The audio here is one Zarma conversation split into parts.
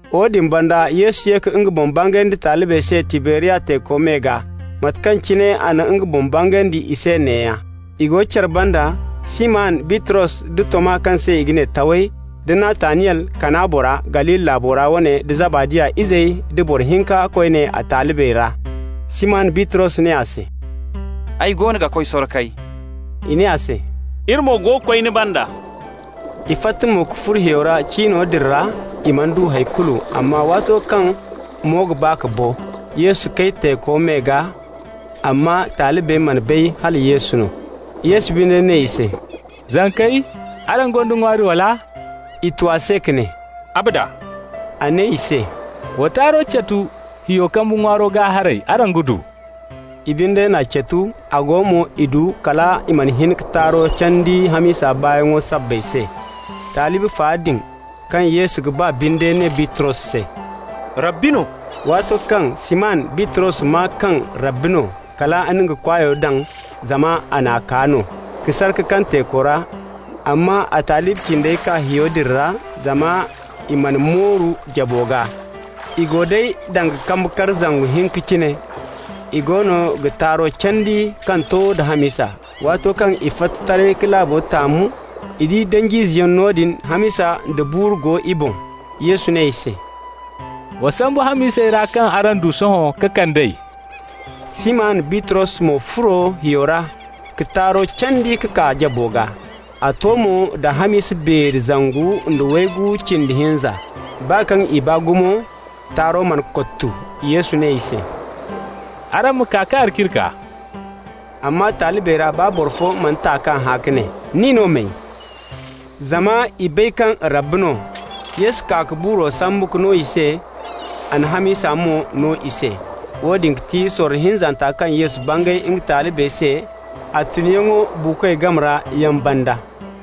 Woodin banda Yesu ye ka nga boŋ bangandi talibey se Tiberiya teeko me gaa. Mate kaŋ cine a na nga boŋ bangandi i se neeya: I go care banda, Siman Bitros, da Toma kaŋ se i ga ne Taway, da Nataniyel Kana bora, Galili laabo ra wane, da Zabadi izey, da boro hinka koyne a talibey ra. Siman Bitros ne i se: «Ay goono ga koy sorkay.» I ne a se: «Iri mo ga koy ni banda.» I fatta mo ka furo hiyo ra. Cino din ra i mana du hay kulu. Amma waato kaŋ mo ga ba ka bo, Yesu kay teeko me gaa, amma talibey mana bay hala Yesu no. Yesu binde ne i se: «Zankey, araŋ gonda ŋwaari, wala?» I tu a se ka ne: «Abada!» A ne i se: «Wa taaro catu hiyo kambe ŋwaaro gaa haray, araŋ ga du.» I binde n'a catu. A go mo i du kal i mana hin ka taaro candi hamisa baayaŋo sabbay se. Talibi fa din kaŋ Yesu ga ba binde ne Bitros se: «Rabbi no!» Waato kaŋ Siman Bitros maa kaŋ Rabbi no, kal a na nga kwaayo daŋ (zama a n'a kaa no) ka sar ka kaŋ teeko ra. Amma talibi cindey kaa hiyo din ra, zama i mana mooru jabo gaa. I go day danga kambe kar zangu hinka cine. I goono ga taaro candi kaŋ to da hamisa. Waato kaŋ i fatta taray ka laabo taamu, i di danj'izeyaŋ noodin. Hamisa da buuru go i boŋ. Yesu ne i se: «Wa sambu hamisey ra kaŋ araŋ du sohõ ka kand'ey.» Siman Bitros mo furo hiyo ra ka taaro candi ka kaa jabo gaa. A to mo da hamisa beeri zangu nda waygu cindi hinza. Baa kaŋ i baa gumo, taaro mana kottu. Yesu ne i se: «Araŋ ma kaa ka alciri kaa.» Amma talibey ra baa boro fo mana ta k'a hã ka ne: «Nin no may?» Zama i bay kaŋ Rabbi no. Yesu kaa ka buuro sambu ka no i se, a na hamisa mo no i se. Woone ga ti sorro hinzanta kaŋ Yesu bangay nga talibey se a tunyaŋo buukoy game ra yaŋ banda.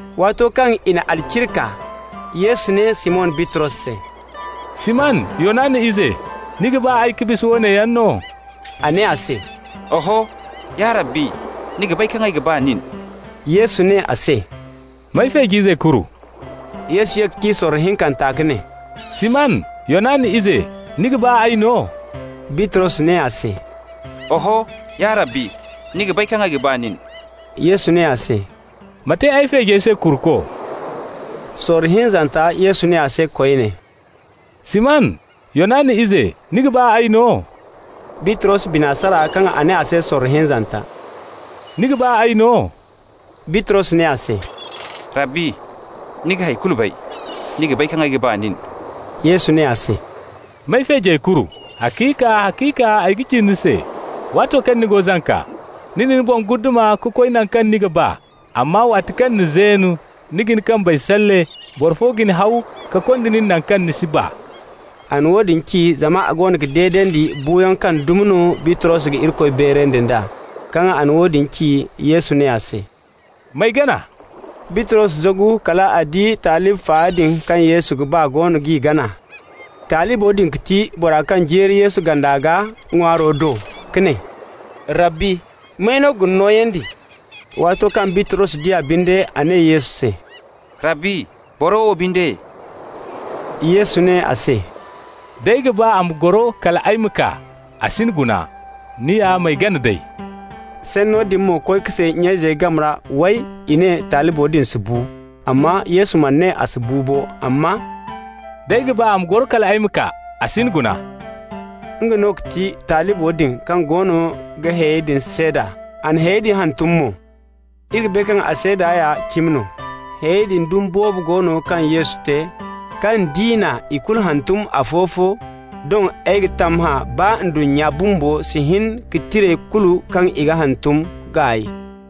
Waato kaŋ i na alciri kaa, Yesu ne Siman Bitros se: «Siman, Yonana ize, ni ga ba ay ka bisa woone yaŋ no?» A ne a se: «Oho, ya Rabbi, ni ga bay kaŋ ay ga ba nin.» Yesu ne a se: «M'ay feej'izey kuru.» Yesu ye ka ci a se sorro hinkanta ka ne: «Siman, Yonana ize, ni ga ba ay no?» Bitros ne a se: «Oho, ya Rabbi, ni ga bay kaŋ ay ga ba nin.» Yesu ne a se: «Ma te ay feejey se kuruko.» Sorro hinzanta Yesu ne a se koyne: «Siman, Yonana ize, ni ga ba ay no?» Bitros bina sara kaŋ a ne a se sorro hinzanta: «Ni ga ba ay no?» Bitros ne a se: «Rabbi, ni ga hay kulu bay. Ni ga bay kaŋ ay ga ba nin.» Yesu ne a se: «M'ay feejey kuru. Haciika, haciika ay ga ci ni se: waato kaŋ ni go zanka, ni na ni boŋ guddama ka koy naŋ kaŋ ni ga ba. Amma waati kaŋ ni zeen, ni ga ni kambey salle, boro fo ga ni haw ka konda nin naŋ kaŋ ni si ba.» (A na woodin ci zama a goono ga deedandi buuyaŋ kaŋ dumi no Bitros ga Irikoy beerandi nd'a.) Kaŋ a na woodin ci, Yesu ne a se: «M'ay gana.» Bitros zagu, kal a di talibi fa din kaŋ Yesu ga ba goono g'i gana. Talibo din ga ti bora kaŋ jeeri Yesu ganda gaa ŋwaaro do ka ne: «Rabbi, may no ga ni nooyandi?» Waato kaŋ Bitros di a binde, a ne Yesu se: «Rabbi, boro wo binde?» Yesu ne a se: «D'ay ga ba a ma goro kal ay ma kaa, a si ni guna. Nin ya m'ay gana day!» Sanno din mo koy ka say nya-izey game ra, way, i ne talibo din si bu. Amma Yesu mana ne a si bu bo, amma «d'ay ga ba a ma goro kal ay ma kaa, a si ni guna.» Nga no ga ti talibo din kaŋ goono ga hayey din seeda, a na hayey din hantum mo. Iri ga bay mo kaŋ a seeda ya cimi no. Hayey din dumi boobo go no kaŋ Yesu te, kaŋ d'i na ikulu hantum afo-fo, doŋ ay ga tammahã baa ndunnya bumbo si hin ka tirey kulu kaŋ i ga hantum gaay.